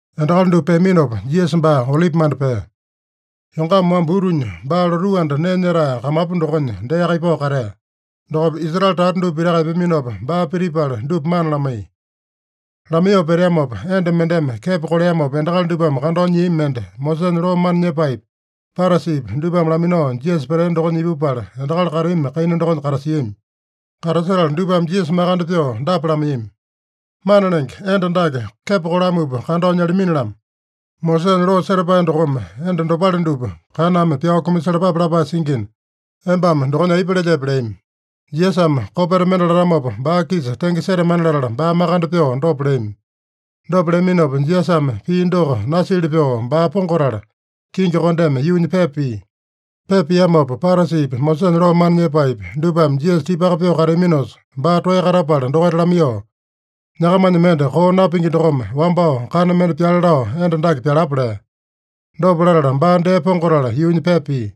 Endakali dupa peaminopa Jisasa baa Olipimanda pea. Yongama wamba utunya baa lotuu anda nee nyetae kamapu dokonya deaka ipao katea. Dokopa Israele tata dupa pitaka epeaminopa, baa pitipala dupa mana lamaiya. Lamaiyoo peteamopa, enda mendeme kepo koleamopa endakali dupame kandao nyiami mende Mosesanya loo mana nyepaepi, Parasipi dupame laminao Jisasa petea dokonya ipupala, endakali kateami kaina dokonya katasiami. Katasetala dupame Jisasa makande pyoo dapa lamaiyami: “Mana Lenge, enda dake kepo kolamupa kandao nyalamini-lamo. Mosesanya loo setapae dokome enda dopale dupa kaname pyao kumasalapape lapae singina, embame dokonya aipa lelyepe?” leami. Jisasame kopeta mende latamopa baa-kisa tenge setamana latala baa makande pyoo dopa leami. Dopa leaminopa, Jisasame pii doko nasili pyoo baa pongatala, kingi kondeme yuunya pepa pia. Pepa piamopa, Parasipi, Mosesanya loo mana nyepaepi, dupame Jisasa tipaka pyoo kateaminosa, baa toeya katapala dokaita lamaiyoo, “Nyakamanya mende koo napingi dokome wambao kana mende pyale lao enda dake pyalapa” lea. Dopa latala baa dee pongatala yuunya pepa pia.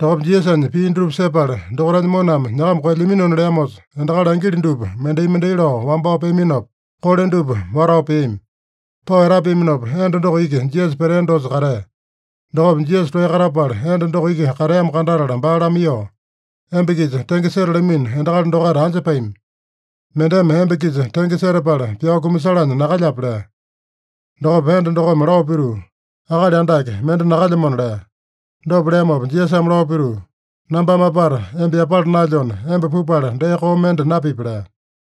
Dokopa Jisasanya pii dutupa sepala, dokaitanya moname nyakama koelyaminona leamosa, endakali angili dupa mendai-mendai lao wambao peaminopa, kole dupa watao peami. Pao etapeaminopa, enda doko iki Jisasa petea dosa katea. Dokopa Jisasa toeya katapala enda doko iki kateamo kandatala baa lamaiyoo, “Emba-kisa tenge setalamino endakali dokaita anja pami? Mendeme emba-kisa tenge setapala pyao kumasalanya nakalyape?” lea. Dokopa enda dokome lao pituu, “Akali Andake, mende nakalyamona” lea. Dopa leamopa Jisasame lao pituu, “Nambame apata emba yapala naelyona, emba pupala dee koo mende napipi” lea.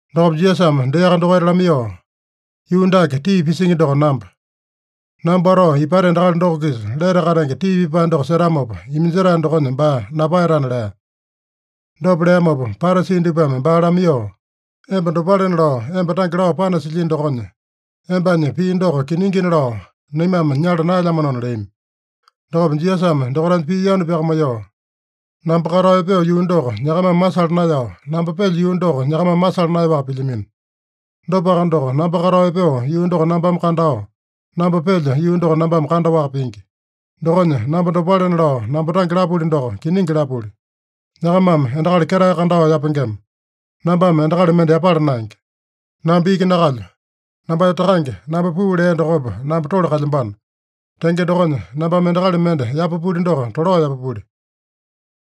Dokopa Jisasame deaka dokaita lamaiyoo, “Yuu dake tii pisingi doko namba. Namba watao ipata endakali doko-kisa lete katenge tii pipae doko setamopa, iminjetae dokonya baa napaeyatana” lea. Dopa leamopa Parasi dupame baa lamaiyoo, “Emba dopalena lao emba tange lao panasilyino dokonya, embanya pii doko kiningina lao naimame nyala naelyamanona” leami. Dokopa Jisasame dokaitanya pii yanu pyakamaiyoo, “Namba katao epeo yuu doko nyakamame masala naeyao, namba pelyo yuu doko nyakamame masala naeyaowaka pilyamino. Dopaka doko namba katao epeo yuu doko nambame kandao, namba pelyo yuu doko nambame kandaowaka pingi. Dokonya namba dopalena lao namba tange lapuli doko, kiningi lapuli. Nyakamame endakali ketae kandao yapengema. Nambame endakali mende yapala naenge. Namba iki nakalyo. Nambanya Takange, namba puu lea dokopa namba tole kalyambano. Tenge dokonya, nambame endakali mende yapapuli doko tolao yapapuli.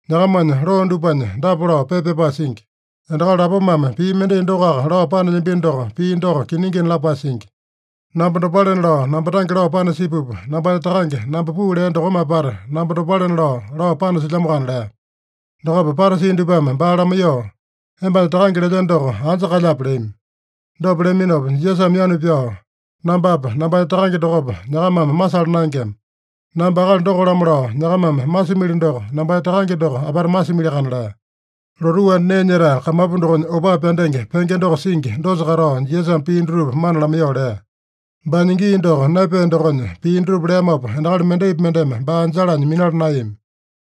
Nyakamanya loo dupanya dapa lao pepa pyapae singi: ‘Endakali lapomame pii mendai dokoaka lao panelyambino doko, pii doko kiningina’ lapae singi. Namba dopalena lao namba tange lao panasipupa, nambanya Takange, namba puu lea dokome apata namba dopalena lao, lao panasilyamoakana” lea. Dokopa Parasi dupame baa lamaiyoo, “Embanya takange lelyeno doko anja kalyape?” leami. Dopa leaminopa Jisasame yanu pyao, “Nambapa, nambanya Takange dokopa nyakamame masala naengema. Namba akali doko-lamo lao nyakamame masimili doko, nambanya Takange doko apata masimiliakana” lea. (Lotuu anda nee nyetae kamapu dokonya opaa pyandenge penge doko singi dosa katao, Jisasame pii dutupa mana lamaiyoo lea. Baanya gii doko naepea dokonya, pii dutupa leamopa endakali mendaipi mendeme baa anjalanya minala naeyami.)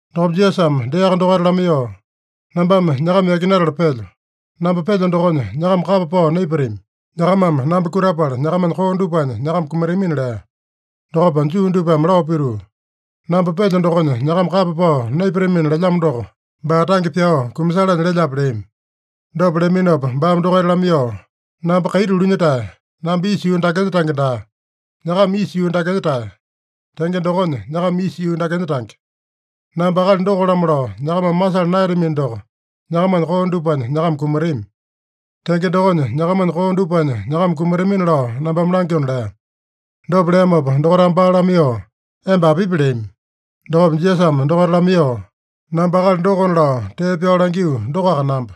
Dokopa Jisasame deaka dokaita lamaiyoo, “Nambame nyakama yakinatala pelyo. Namba pelyo dokonya nyakama kapa pao naipatami. Nyakamame namba kutapala, nyakamanya koo dupanya nyakama kumatamina” lea. Dokopa Juu dupame lao pituu, “ ‘Namba pelyo dokonya nyakama kapa pao naipatamina’ lelyamo doko, baa tange pyao kumasalanya lelyape?” leami. Dopa leaminopa baame dokaita lamaiyoo, “Namba kaiti ulunya-tae. Namba isa yuu dakenya tange daa. Nyakama isa yuu dakenya-tae. Tenge dokonya nyakama isa yuu dakenya tange. Namba akali doko-lamo lao nyakamame masala naeyatamino doko, nyakamanya koo dupanya nyakama kumatami. Tenge dokonya, nyakamanya koo dupanya nyakama kumatamina lao nambame langyona” lea. Dopa leamopa dokaitame baa lamaiyoo, “Emba apipi?” leami. Dokopa Jisasame dokaita lamaiyoo, “Namba akali dokona lao tee pyao langio dokoaka namba.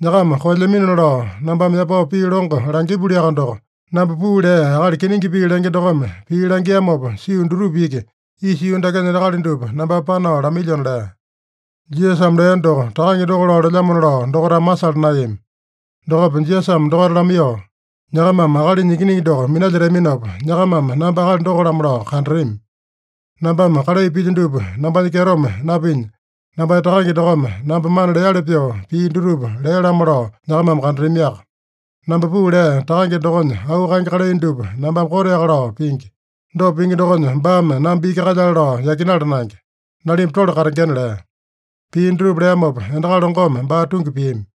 Nyakama koelyaminona lao nambame yapao pii longo langipuliaka doko, namba puu lea Akali kiningi pii lenge dokome pii langiamopa sio dutupa iki, isa yuu dakenya endakali dupa nambame panao lamailyona” lea. (Jisasame lea doko, Takange doko lao lelyamona lao dokaitame masala naeyami.) Dokopa Jisasame dokaita lamaiyoo, “Nyakamame Akalinya Ikiningi doko minalyetaminopa, nyakamame namba akali doko-lamo lao kandatami. Nambame kalai pilyo dupa nambanya kyetome napinya, nambanya Takange dokome namba mana leali pyoo pii dutupa lea-lamo lao nyakamame kandatamiaka. Namba puu lea Takange dokonya auu kaenge kalai dupa nambame koteaka lao pingi. Dopa pingi dokonya, baame namba iki kalyale lao yakinala naenge. Nalimba tole katengena” lea. Pii dutupa leamopa endakali longome baa tungi piami.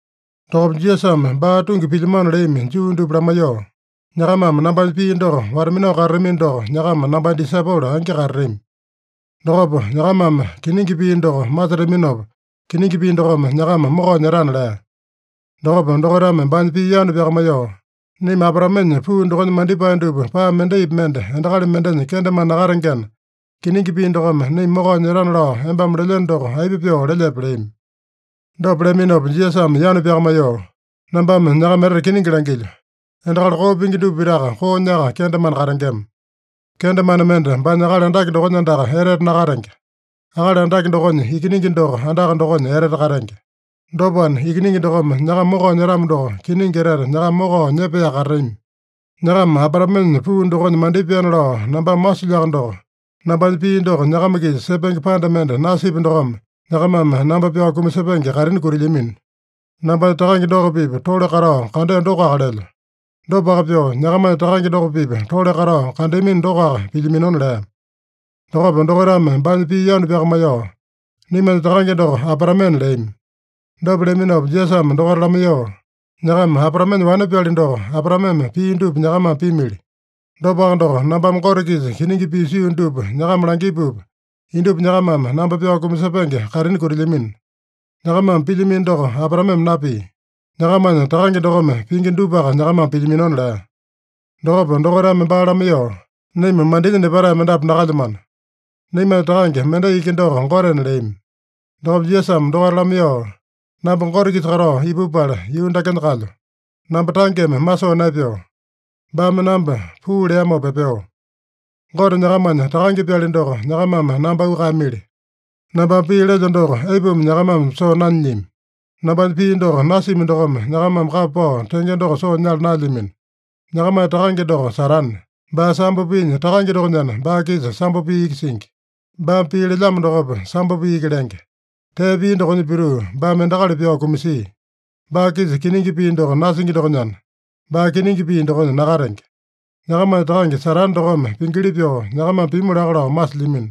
Dokopa Jisasame baa tungi pilyamano leami Juu dupa lamaiyoo, “Nyakamame nambanya pii doko wata-minao katatamino doko, nyakama nambanya disaipolo angi katatami. Dokopa nyakamame kiningi pii doko masetaminopa, kiningi pii dokome nyakama mokao nyetana” lea. Dokopa dokaitame baanya pii yanu pyakamaiyoo, “Naima Abraamenya puu dokonya mandipae dupa paa mendaipi mende endakali mendenya kendemane nakatengena, kiningi pii dokome naima mokao nyetana lao embame lelyeno doko, aipa pyoo lelyepe?” leami. Dopa leaminopa Jisasame yanu pyakamaiyoo, “Nambame nyakama etete kiningi langilyo: Endakali koo pingi dupa pitaka koonyaka kendemane katengema. Kendemane mende baanya akali andake dokonya andaka etete nakatenge. Akali andake dokonya ikiningi doko andaka dokonya etete katenge. Dopana, Ikiningi dokome nyakama mokao nyetamo doko, kiningi etete nyakama mokao nyepaeyaka katatami. Nyakama Abraamenya puu dokonya mandipaena lao nambame masilyoaka doko, nambanya pii doko nyakama-kisa sepenge panda mende nasipya dokome, nyakamame namba pyao kumasepenge kaitini kutilyamino. Nambanya Takange doko-pipa tole katao kandeo dokoaka lelyo. Dopaka pyoo, nyakamanya takange doko-pipa tole katao kandeamino dokoaka pilyaminona” lea. Dokopa dokaitame baanya pii yanu pyakamaiyoo, “Naimanya takange doko Abraamena” leami. Dopa leaminopa Jisasame dokaita lamaiyoo, “Nyakama Abraamenya wane-pyali doko, Abraameme pia dupa nyakamame pimili. Dopaka doko, nambame Gote-kisa kiningi pii sio dupa nyakama langipupa, indupa nyakamame namba pyao kumasepenge kaitini kutilyamino. Nyakamame pilyamino doko Abraameme napia. Nyakamanya takange dokome pingi dupaka nyakamame pilyaminona” lea. Dokopa dokaitame baa lamaiyoo, “Naima mandinya nepatae mendapu nakalyamano. Naimanya Takange mendai iki doko Gotena” leami. Dokopa Jisasame dokaita lamaiyoo, “Namba Gote-kisa katao ipupala yuu dakenya kalyo. Namba tangeme masoo naepeo. Baame namba puu leamopa epeo. Gote nyakamanya Takange-pyali doko, nyakamame namba auu kaeyamili. Nambame pii lelyo doko aipuma nyakamame soo nanyilyami? Nambanya pii doko nasimi dokome, nyakamame kapa pao tenge doko soo nyala naelyamino. Nyakamanya takange doko Satane. Baa sambo piinya takange dokonyana, baa-kisa sambo pii iki singi. Baame pii lelyamo dokopa, sambo pii iki lenge. Tee pia dokonya pituu, baame endakali pyao kumasia. Baa-kisa kiningi pii doko nasingi dokonyana, baa kiningi pii dokonya nakatenge. Nyakamanya takange Satane dokome pingili pyoo nyakamame pimu laka lao masilyamino.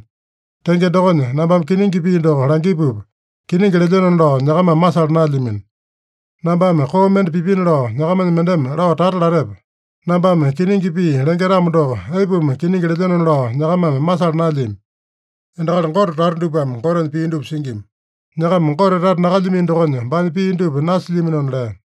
Tenge dokonya, nambame kiningi pii doko langipupa, kiningi lelyenona lao nyakamame masala naelyamino. Nambame koo mende pipina lao nyakamanya mendeme lao tata latepe? Nambame kiningi pii lenge-tamo doko, aipuma kiningi lelyenona lao nyakamame masala naelyami? Endakali Gote tata dupame Gotenya pii dupa singima. Nyakama Gote tata nakalyamino dokonya, baanya pii dupa nasilyaminona” lea.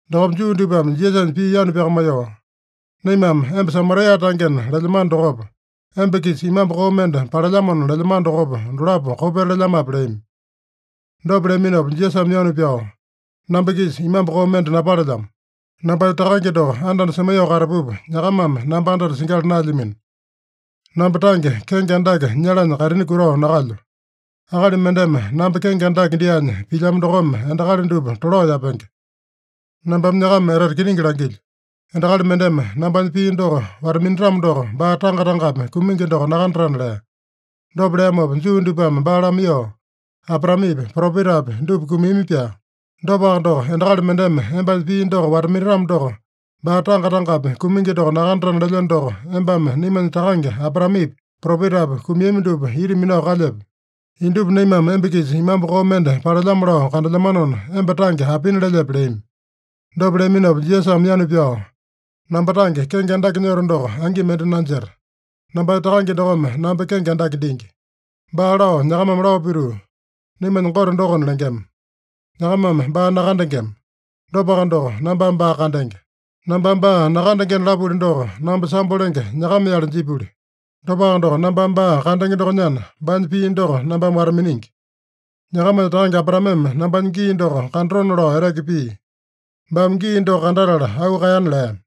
Dokopa Juu dupame Jisasanya pii yanu pyakamaiyoo, “Naimame emba Samaria tangena lelyamano dokopa, emba-kisa imambu koo mende palelyamona lelyamano dokopa, dolapo kopeta lelyamape?” leami. Dopa leaminopa Jisasame yanu pyao, “Namba-kisa imambu koo mende napalelyamo. Nambanya Takange doko anda-anda semaiyoo katapupa, nyakamame namba anda-anda singyala naelyamino. Namba tange kenge andake nyalanya kaitini kutao nakalyo. Akali mendeme namba kenge andake dyaanya pilyamo dokome endakali dupa tolao yapenge. Nambame nyakama etete kiningi langilyo: Endakali mendeme nambanya pii doko wata-minatamo doko, baa tanga-tangapi kumingi doko nakandatana” lea. Dopa leamopa Juu dupame baa lamaiyoo, “Abraamepi, propetapi dupa kumiami-pyaa. Dopaka doko, endakali mendeme embanya pii doko wata-minatamo doko, baa tanga-tangapi kumingi doko nakandatana lelyeno doko, embame naimanya takange Abraamepi, propetapi kumiami dupa ita minao kalyepe? Indupa naimame emba-kisa imambu koo mende palelyamo lao kandelyamanona, emba tange apina lelyepe?” leami. Dopa leaminopa Jisasame yanu pyao, “Namba tange kenge andake nyoto doko, angi mende nanjeta. Nambanya Takange dokome namba kenge andake dingi. Baa lao nyakamame lao pituu, ‘Naimanya Gote dokona’ lengema. Nyakamame baa nakandengema. Dopaka doko, nambame baa kandenge. Nambame baa nakandengena lapuli doko, namba sambo lenge nyakama-yale jipuli. Dopaka doko, nambame baa kandenge dokonyana, baanya pii doko nambame wata-miningi. Nyakamanya takange Abraameme nambanya gii doko kandatona lao eteke pia. Baame gii doko kandatala auu kaeyana” lea.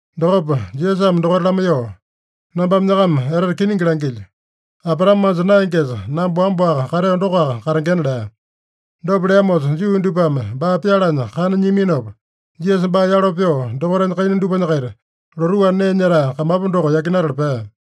Dokopa Jisasame dokaita lamaiyoo, “Nambame nyakama etete kiningi langilyo: Abraame manja naengesa, namba wamba-waka kateo dokoaka katengena” lea. Dopa leamosa Juu dupame baa pyalanya kana nyiaminopa, Jisasa baa yalo pyoo, dokaitanya kaina dupanya-kaita lotuu anda nee nyetae kamapu doko yakinatala pea.